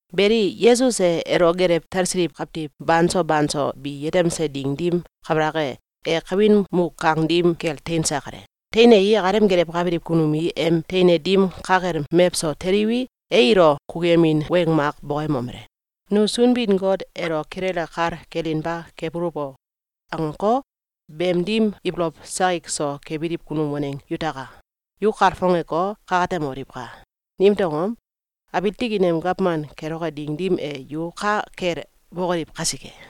Beli, Yesus e elo gelew talsiliw kawtiw banso banso bi yetemse ding dim kabalak e, e kawin muk kang dim kel teinse kale. Teinei, akalem gelewkabiliw kunum i em teine dim ka kel mewso teliwi, e ilo kukuyemin weng mak bokoyemomele: “‘Nu Sunbin-Got elo kilele kal kelinba kebuluw o!’, angeko, beem dim ibolow sakik so kebiliw kunum waneng yutaka! Yu kalfongeko, kakatemoliwka! Nimtew angom? Abiil tikin em gawman keloke ding dim e, yu ka kel bokoliw kasike.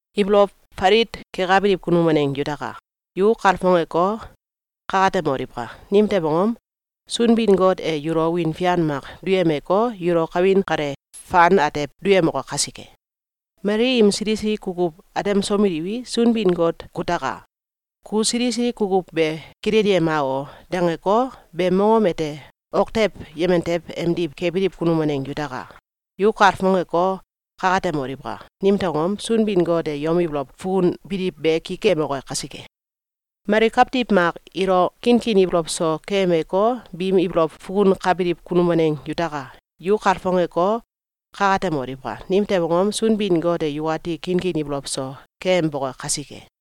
Ibolow falit kekabiliw kunum waneng yutaka! Yu kalfongeko, kakatemoliwka! Nimtew angom? Sunbin-Got e yulo wiin fian mak duyemeko, yulo kawin kale fan atew duyemoke kasike. Mali im sili sili kukuw atemsomeliwi, ‘Sunbin-Got kutaka! Ku sili sili kukuw be kilelyema o!’, dangeko, beem mongom ete ok tew yemen tew emdiw kebiliw kunum waneng yutaka! Yu kalfongeko, kakatemoliwka! Nimtew angom? Sunbin-Got e yom ibolow fukunbiliw be ki kemoke kasike. Mali kawtiw mak ilo kinkin ibolow so keyemeko, biim ibolow fukunkabiliw kunum waneng yutaka! Yu kalfongeko, kakatemoliwka! Nimtew angom? Sunbin-Got e yukati kinkin ibolow so keyemboke kasike.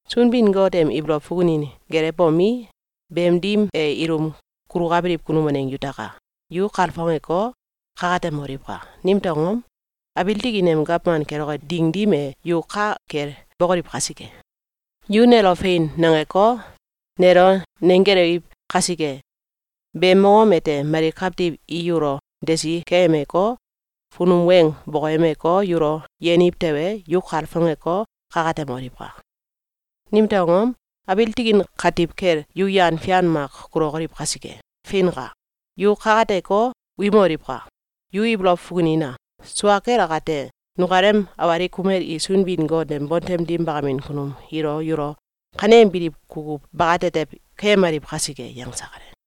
Sunbin-Got em ibolow fukunin gelewbomi, beem dim e ilum kulukabiliw kunum waneng yutaka! Yu kalfongeko, kakatemoliwka! Nimtew angom? Abiil tikin em gawman keloke ding dim e, yu ka kel bokoliw kasike. Yu nelo “Fein!”, nangeko, nelo nenggelewiw kasike, beem mongom ete mali kawtiw i yulo desi keyemeko, funum weng bokoyemeko, yulo yeniw tewe, yu kalfongeko, kakatemoliwka! Nimtew angom? Abiil tikin katiw kel yu yan fian mak kulokoliw kasike. Feinka! Yu kakateko, wimoliwka! Yu ibolow fukunina! Sua kel akate, nukalem awalik kumel i Sunbin-Got em bontem dim bakamin kunum ilo yulo kaneembiliw kukuw bakatetew keyemaliw kasike.”, yangse kale.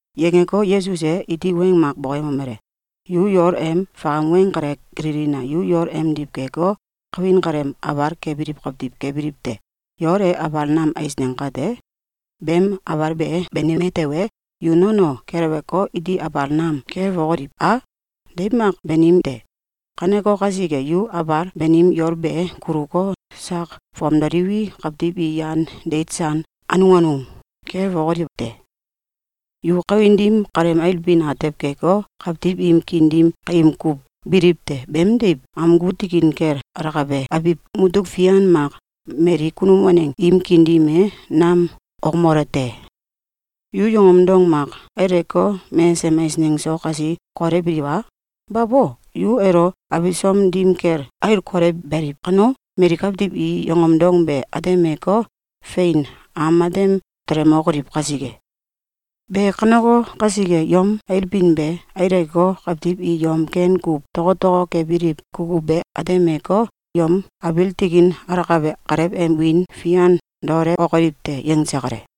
Yangeko, Yesus e iti weng mak bokoyemomele: “Yu yol em fakam weng kale kililina! Yu yol emdiw keko, kawin kaleem abal kebiliw kawtiw kebiliw te. Yol e abal nam eisneng kate, beem abal be banime tewe, yu nono keleweko, iti abal nam kelewokoliw a? Deiw mak banim te. Kaneko kasike, yu abal banim yol be kuluko, sak fomdoliwi, kawtiw i yan deit san anung anung kelewokoliw te. Yu kawin dim kaleem ailbin atew keko, kawtiw im kiin dim kaim kuw biliw te. Beemdiw, amgu tikin kel alakabe abiw mutuk fian mak mali kunum waneng im kiin dim e nam okmole te. Yu yongom dong mak aileko, mesesem eisneng so kasi kolewbiliw a? Babo! Yu elo abisom dim kel ail kolewbeliw kano, mali kawtiw i yongom dong be atemeko, fein am matem telemokoliw kasike. Be kaneko kasike, yom ailbin be aileko, kawtiw i yom ken kuw tokotoko kebiliw kukuw be atemeko, yom abiil tikin alakabe Kalew em wiin fian daolewokoliw te.”, yangse kale.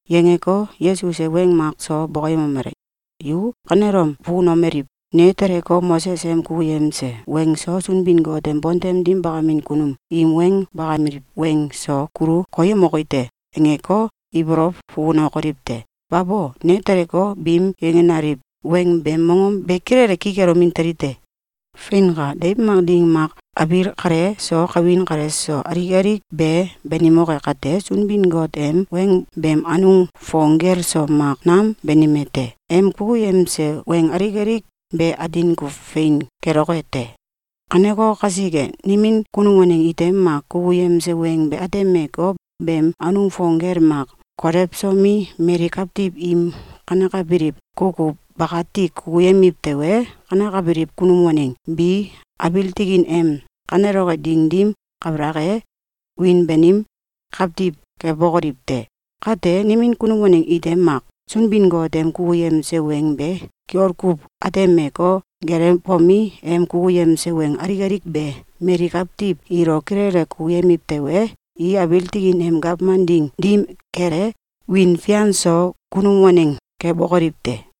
Yangeko, Yesus e weng mak so bokoyemomele: “Yu kanelom fukunomeliw: ‘Ne teleko, Moses em kukuyemse weng so, Sunbin-Got em bontem dim bakamin kunum im weng bakameliw weng so kulu koyemoki te!’, angeko, ibolow fukunokoliw te! Babo! Ne teleko, biim yangenaliw weng beem mongom be kilele ki kelomin teli te. Feinka! Deiw mak ding mak abiil kale so kawin kale so alik alik be banimoke kate, Sunbin-Got em weng beem anung fong gel so mak nam banime te. Em kukuyemse weng alik alik be atin kuw fein keloke te. Kaneko kasike, nimin kunum waneng ite mak kukuyemse weng be atemeko, beem anung fong gel mak kolewsomi, mali kawtiw im kanekabiliw kukuw bakati kukuyemiw tewe, kanekabiliw kunum waneng bi abiil tikin em kaneloke ding dim kabalak e, wiin banim kawtiw kebokoliw te. Kate, nimin kunum waneng ite mak Sunbin-Got em kukuyemse weng be kiol kuw atemeko, gelewbomi, em kukuyemse weng alik alik be mali kawtiw ilo kilele kukuyemiw tewe, i abiil tikin em gawman ding dim kel e, wiin fian so kunum waneng kebokoliw te.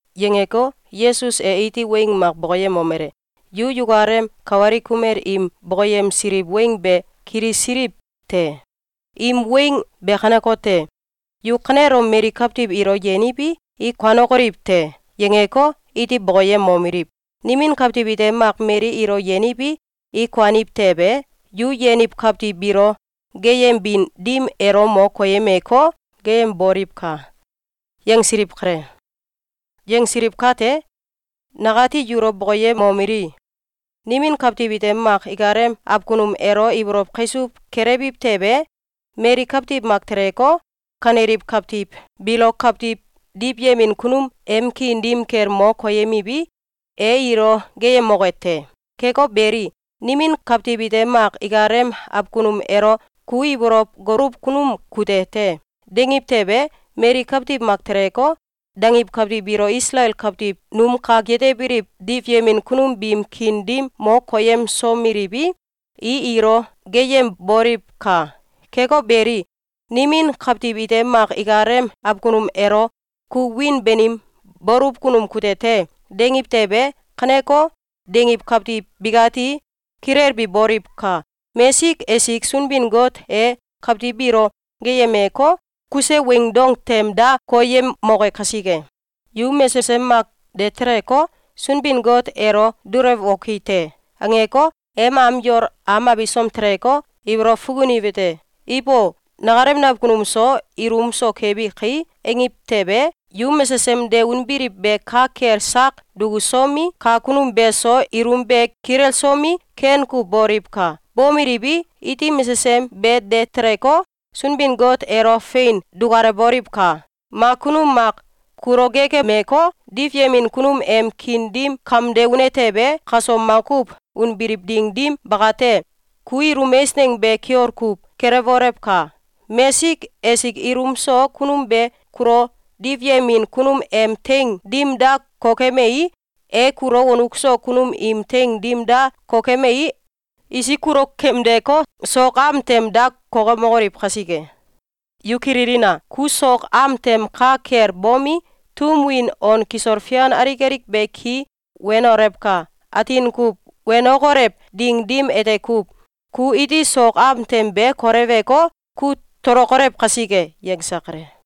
Yangeko, Yesus e iti weng mak bokoyemomele: “Yu yukalem kawalik kumel im bokoyemsiliw weng be kilisiliw te. Im weng be kanekote: ‘Yu kanelom mali kawtiw ilo yeniwi, i kuanokoliw te!’, yangeko, iti bokoyemomeliw: ‘Nimin kawtiw ite mak mali ilo yeniwi, i kuaniw tewe, yu yeniw kawtiw biilo geeyembin dim elo mo koyemeko, geeyemboliwka!’, yangsiliw kale. Yangsiliw kate, nakati yulo bokoyemomeli: Nimin kawtiw ite mak ikalem akunum elo ibolow kaisuw kelewiw tewe, mali kawtiw mak teleko, kaneliw kawtiw biilo kawtiw diwyemin kunum em kiin dim kel mo koyemiwi, e ilo geeyemoke te. Keko beli, nimin kawtiw ite mak ikalem akunum elo ‘Ku ibolow goluw kunum kute te!’, dangiw tewe, mali kawtiw mak teleko, dangiw kawtiw biilo Isalael kawtiw num kak yetebiliw diwyemin kunum biim kiin dim mo koyemsomeliwi, i ilo geeyemboliwka! Keko beli, nimin kawtiw ite mak ikalem akunum elo ‘Ku wiin banim, baluw kunum kute te!’, dangiw tewe, kaneko, dangiw kawtiw bikati kilelbi boliwka! Mesik esik Sunbin-Got e kawtiw biilo geeyemeko, kuse weing dong tem da koyemoke kasike. Yu mesesem mak de teleko, ‘Sunbin-Got elo dulewoki te!’, angeko, em am yol am abisom teleko, ibolow fukuniwete: ‘Ibo! Nakalem nakunum so ilum so kebi kai!’, angiw tewe, yu mesesem de unbiliw be ka kel sak dukusomi, kakunum beso ilum be kilelsomi, ken kuw boliwka! Bomeliwi, iti mesesem be de teleko, Sunbin-Got elo fein dukalewboliwka! Mak kunum mak kulo geekemeko, diwyemin kunum em kiin dim kamde une tewe, kaso makuw unbiliw ding dim bakate, ku ilum eisneng be kiol kuw kelewbolewka! Mesik esik ilum so kunum be kulo diwyemin kunum em teing dim da kokemei, e kulo wonuk so kunum im teing dim da kokemei, isik kulo kamdeko, sok am tem da kokemokoliw kasike. Yu kililina! Ku sok am tem ka kel bomi, tum win on kisol fian alik alik be ki wenolewka! Atin kuw wenokolew ding dim ete kuw, ku iti sok am tem be kolewko, kut tolokolew kasike.”, yangse kale.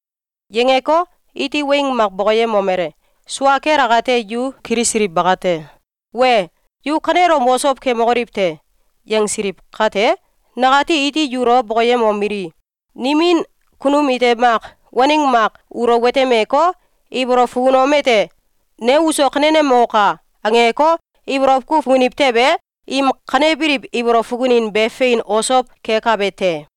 Yangeko, iti weng mak bokoyemomele: “Sua kel akate yu kilisiliw bakate: ‘Wee! Yu kanelom osow kemokoliw te!’, yangsiliw kate, nakati iti yulo bokoyemomeli: Nimin kunum ite mak waneng mak ulo watemeko, ibolow fukunom ete: ‘Ne uso kanenemoka!’, angeko, ibolow kuw fukuniw tewe, im kanebiliw ibolow fukunin be fein osow kekabe te.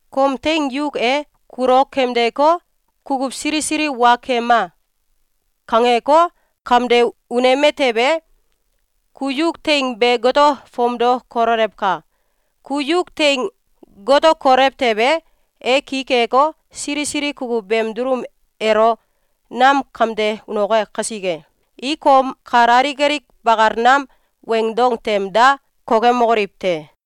Kom teing yuk e kulo kamdeko, ‘Kukuw sili sili wa kema!’, kangeko, kamde uneme tewe, ku yuk teing be gato fomdo kololewka! Ku yuk teing gato kolew tewe, e ki keko, sili sili kukuw beem dulum elo nam kamde unoke kasike, i kom kal alik alik bakal nam weng dong tem da kokemokoliw te.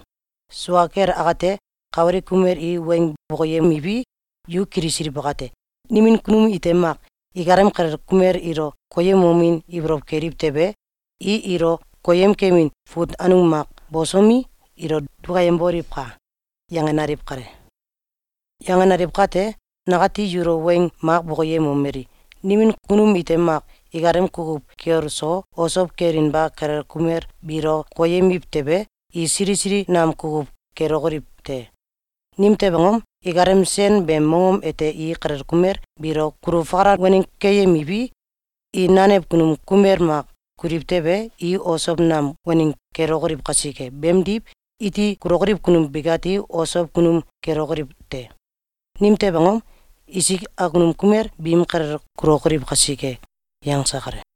Sua kel akate, kawalik kumel i weng bokoyemiwi, yu kilisiliw bakate: ‘Nimin kunum ite mak ikalem kalel kumel ilo koyemomin ibolow keliw tewe, i ilo koyemkemin fut anung mak bosomi, ilo dukayemboliwka!’, yangenaliw kale. Yangenaliw kate, nakati yulo weng mak bokoyemomeli: Nimin kunum ite mak ikalem kukuw kiol so, osow kelinba kalel kumel biilo koyemiw tewe, i sili sili nam kukuw kelokoliw te. Nimtew angom? Ikalem sen beem mongom ete i kalel kumel biilo kulu fakalan waneng keyemiwi, i nanew kunum kumel mak kuliw tewe, i osow nam waneng kelokoliw kasike. Beemdiw, iti kulokoliw kunum bikati osow kunum kelokoliw te. Nimtew angom? Isik akunum kumel biim kalel kulokoliw kasike.”, yangse kale.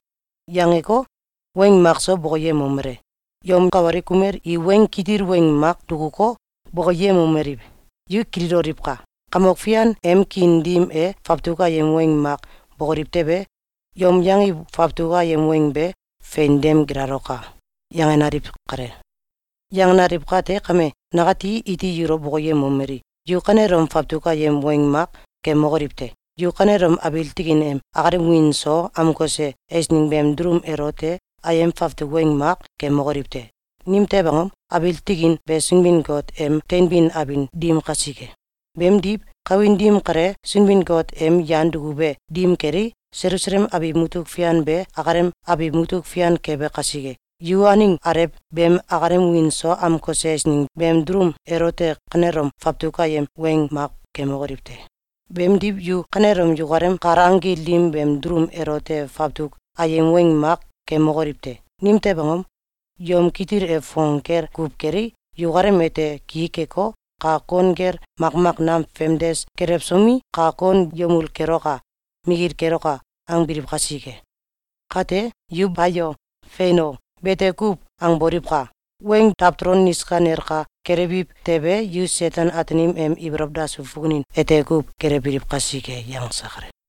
Yangeko, weng makso bokoyemomele: “Yom kawalik kumel i weng kitil weng mak dukuko, bokoyemomeliw: ‘Yu kililoliwka! Kamok Fian em kiin dim e fawtuk ayem weng mak bokoliw tewe, yom yangiw fawtuk ayem weng be fein dem gilaloka!’, yangenaliw kale. Yangenaliw kate kame, nakati iti yulo bokoyemomeli: Yu kanelom fawtuk ayem weng mak kemokoliw te! Yu kanelom abiil tikin em akalem wiin so amkose eisneng beem dulum elote ayem fawtuk weng mak kemokoliw te! Nimtew angom? Abiil tikin be Sunbin-Got em teinbin abin dim kasike. Beemdiw, kawin dim kale Sunbin-Got em yan dukube dim kelei, Selusalem abiw mutuk fian be akalem abiw mutuk fian kebe kasike, yu aneng alew beem akalem wiin so amkose eisneng beem dulum elote kanelom fawtuk ayem weng mak kemokoliw te! Beemdiw, yu kanelom yukalem kal anggil dim beem dulum elote fawtuk ayem weng mak kemokoliw te! Nimtew angom? Yom kitil e fong gel kuw kelei, yukalem ete ki keko, kak kon gel makmak nam famdes kelewsomi, ‘Kak kon yemul keloka! Mikil keloka!’, angbiliw kasike. Kate, yu ‘Bayo!’, ‘Fein o!’, bete kuw angboliwka! Weng dawtolo niska nelka kelewbiw tewe, yu Seten-Ataanim em ibolow dasuw fukunin ete kuw gelewbiliw kasike.”, yangse kale.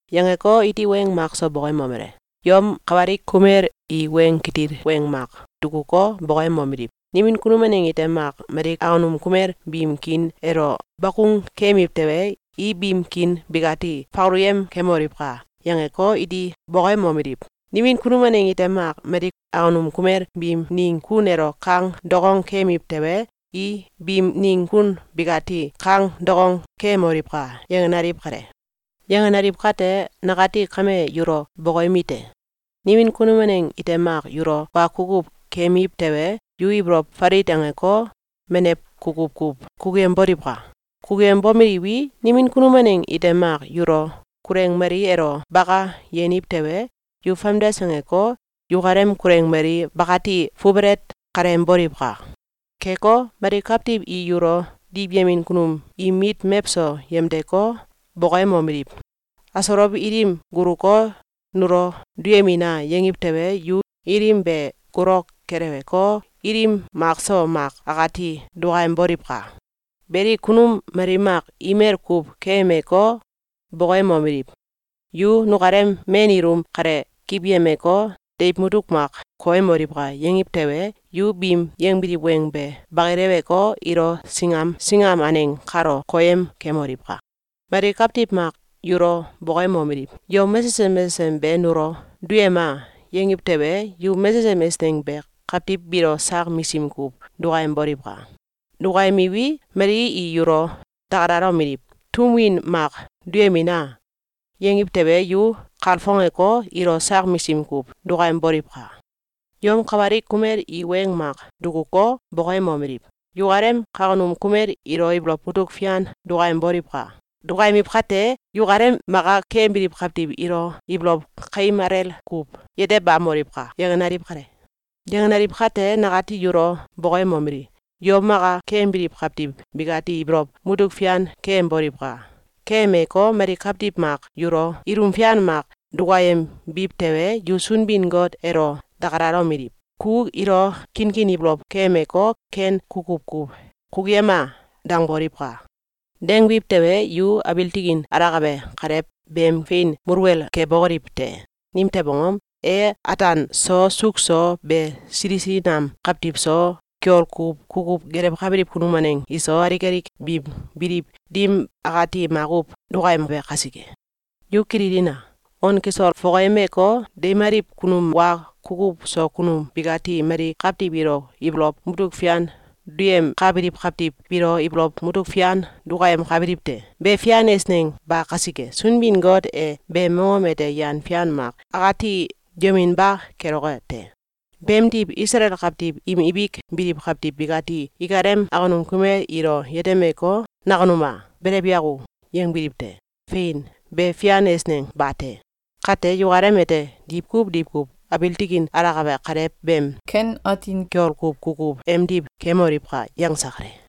Yangeko, iti weng makso bokoyemomele: “Yom kawalik kumel i weng kitil weng mak dukuko, bokoyemomeliw: ‘Nimin kunum waneng ite mak mali akunum kumel biim kiin elo bakung kemiw tewe, i biim kiin bikati fakaluyem kemoliwka!’, yangeko, iti bokolomeliw: ‘Nimin kunum waneng ite mak mali akunum kumel biim ning kun elo kang dukong kemiw tewe, i biim ning kun bikati kang dukong kemoliwka!’, yangenaliw kale. Yangenaliw kate, nakati kame yulo bokoyemite: Nimin kunum waneng ite mak yulo wa kukuw keyemiw tewe, yu ibolow falit angeko, menew kukuw kuw kukuyemboliwka! Kukuyembomeliwi, nimin kunum waneng ite mak yulo kuleng mali elo baka yeniw tewe, yu famdes angeko, yukalem kuleng mali bakati fubelet kaleyemboliwka! Keko, mali kawtiw i yulo diwyemin kunum im mit mewso yemdeko, bokoyemomeliw: ‘Asolow ilim guloko, nulo duyemina!’, yangiw tewe, yu ilim be gulok keleweko, ilim makso mak akati dukayemboliwka! Beli, kunum mali mak imel kuw keyemeko, bokoyemomeliw: ‘Yu nukalem men ilum kale kiwyemeko, deiw mutuk mak koyemoliwka!’, yangiw tewe, yu biim yangbiliw weng be bakileweko, ilo singam singam aneng kalo koyem kemoliwka! Mali kawtiw mak yulo bokoyemomeliw: ‘Yom mesesem mesesem be nulo duyema!’, yangiw tewe, yu mesesem eisneng be kawtiw biilo sak misim kuw dukayemboliwka! Dukayemiwi, mali i yulo dakalalomeliw: ‘Tum win mak duyemina!’, yangiw tewe, yu kalfongeko, ilo sak misim kuw dukayemboliwka! Yom kawalik kumel i weng mak dukuko, bokoyemomeliw: ‘Yukalem kawkunum kumel ilo ibolow mutuk fian dukayemboliwka! Dukayemiw kate, yukalem maka keyembiliw kawtiw ilo ibolow kaim alel kuw yetebamoliwka!’, yangenaliw kale. Yangenaliw kate, nakati yulo bokoyemomeli: Yom maka keyembiliw kawtiw bikati ibolow mutuk fian keyemboliwka! Keyemeko, mali kawtiw mak yulo ilum fian mak dukayembiw tewe, yu Sunbin-Got elo dakalalomeliw: ‘Ku ilo kinkin ibolow keyemeko, ken kukuw kuw kukuyema!’, dangboliwka! Dangbiw tewe, yu abiil tikin alakabe Kalew beem fein muluwel kebokoliw te. Nimtew angom? E ataan so suuk so be sili sili nam kawtiw so, kiol kuw kukuw gelewkabiliw kunum waneng iso, alik alik biim biliw dim akati makuw dukayembe kasike. Yu kililina! On kisol fokoyemeko, deimaliw kunum wa kukuw so kunum bikati mali kawtiw ilo ibolow mutuk fian duyemkabiliw kawtiw biilo ibolow mutuk fian dukayemkabiliw te. Be fian eisneng ba kasike, Sunbin-Got e beem mongom ete yan fian mak akati duyeminba keloke te. Beemdiw, Isalael kawtiw im ibik biliw kawtiw bikati ikalem awkunum kumel ilo yetemeko, ‘Nakunum a! Belew yako!’, yangbiliw te. Fein, be fian eisneng bate! Kate, yukalem ete diwkuw diwkuw abiil tikin alakabe Kalew beem ken atin kiol kuw kukuw emdiw kemoliwka!”, yangse kale.